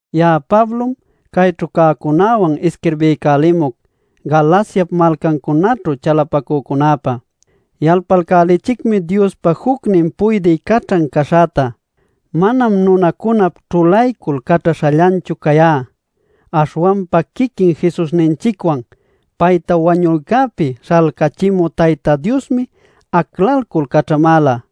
Ya'a Pablom cayćhu cäcunäwan isquirbiycälimuc Galaciap malcancunaćhu chalapacücunäpä. Yalpalcälichicmi Diospa jucnin puydï caćhan caśhäta. Manam nunacunap ćhulaycul caćhaśhallanchu cayá. Aśhwanpa quiquin Jesusninchicwan payta wañuycäpi śhalcachimü Tayta Diosmi aclalcul caćhamäla.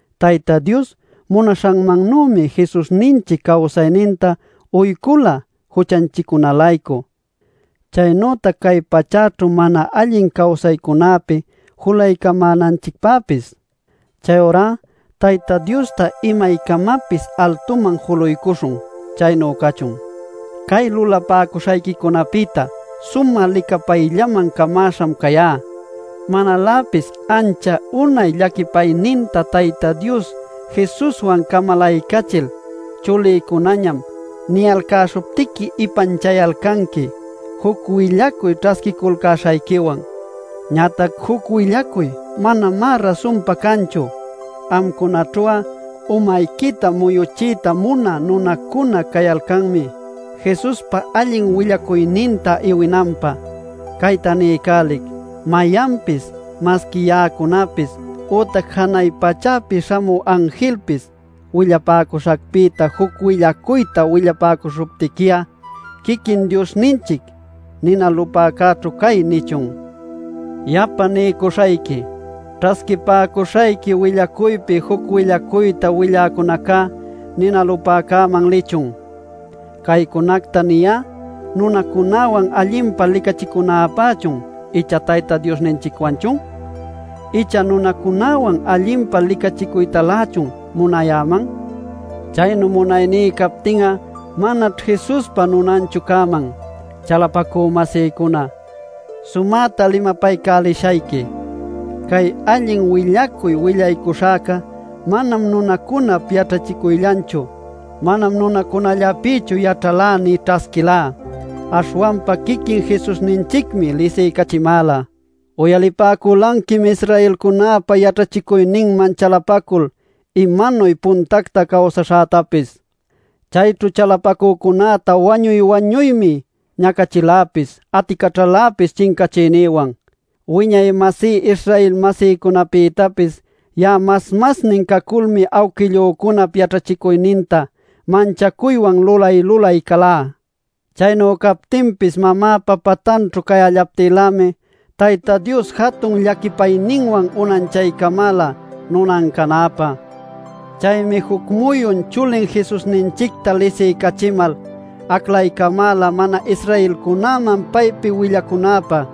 Tayta Dios munaśhanmannümi Jesusninchic cawsayninta uycula juchanchiccuna-laycu, chaynütac cay pachäćhu mana allin cawsaycunäpi julaycamänanchicpäpis. Chayurá Tayta Diosta imaycamapis altuman juluycuśhun. Chaynu cachun. ¡Cay lulapäcuśhayquicunapïta sumä licapayllaman camaśham cayá! ¡Manaläpis ancha unay llaquipayninta Tayta Dios Jesuswan camalaycachil “chulïcunañam” niyalcäśhuptiqui ipanchayalcanqui juc willacuyta ćhasquiculcäśhayquiwan! Ñatac juc willacuy manamá rasunpa canchu. Amcunaćhu'a umayquita muyuchiyta munä nunacuna cayalcanmi, Jesuspa allin willacuyninta iwinanpä. Cayta niycälic: ¡mayanpis, masqui ya'acunapis, ütac janay pachäpi śhamü anjilpis willapäcuśhäpïta juc willacuyta willapäcuśhuptiqui'a, quiquin Diosninchic “nina lupäcäćhu cay” nichun! Yapa niycuśhayqui: ¡Ćhasquipäcuśhayqui willacuypi juc willacuyta willacücunaca nina lupäcäman lichun! ¿Caycunacta niyá nunacunäwan allinpa licachicunäpächun icha Tayta Diosninchicwanchun? ¿Ichá nunacunäwan allinpa licachicuytalächun munayäman? Chaynu munayní captin'a manaćh Jesuspa nunanchu cäman. Chalapacü-masïcuna, sumäta limapaycälishayqui. Cay allin willacuy willacuśhäca manam nunacunap yaćhachicuyllanchu. Manam nunacunallapïchu yaćhalá nï ćhasquilá. Aśhwanpa quiquin Jesusninchicmi lisiycachimäla. Uyalipäculanquim Israelcunäpa yaćhachicuyninman chalapacul imanuy puntacta cawsaśhätapis: chayćhu chalapacücunäta wañuy-wañuymi, ñacachiläpis aticaćhaläpis chincachiynïwan. Wiñay-masí Israel-masïcunapïtapis ya'a mas masnin caculmi awquillücunap yaćhachicuyninta manchacuywan lulay-lulay calá. Chaynu captinpis mamäpa patanćhu cayallaptïlämi Tayta Dios jatun llaquipayninwan unanchaycamäla nunan canäpä. Chaymi juc muyun chulin Jesusninchicta lisiycachimal, aclaycamäla mana-Israelcunäman paypi willacunäpä.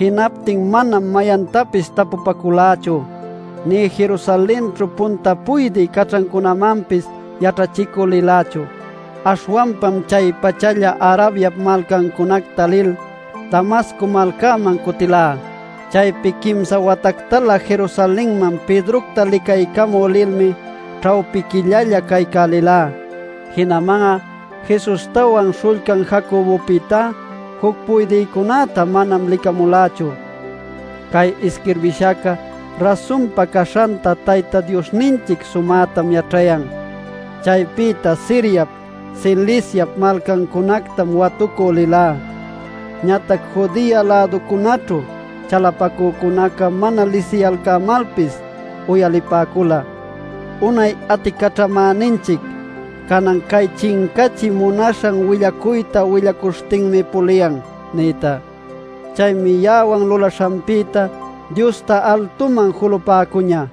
Jinaptin manam mayantapis tapupaculächu nïtac Jerusalenćhu punta puydï caćhacücunämanpis yaćhachicü lilächu. Aśhwanpam chay-pachalla Arabiap malcancunacta lil, Damasco malcaman cutilá. Chaypi quimsa watactalä Jerusalenman Pedrocta licaycamü lilmi ćhawpi quillalla caycälilá. Jinaman'a Jesustawan śhullcan Jacobopïtá juc puydïcunäta manam licamulächu. Cay isquirbishäca rasunpa caśhanta Tayta Diosninchic sumätam yaćhayan. Chaypïta Siriap, Ciliciap malcancunactam watucü lilá. Ñatac Judea-läducunaćhu chalapacücunaca mana lisiyalcämalpis uyalipäcula: “Unay aticaćhamäninchic canan chay chincachiy munaśhan willacuyta willacuśhtinmi puliyan” nïta. Chaymi ya'awan lulaśhanpïta Diosta altuman julapäcuñä.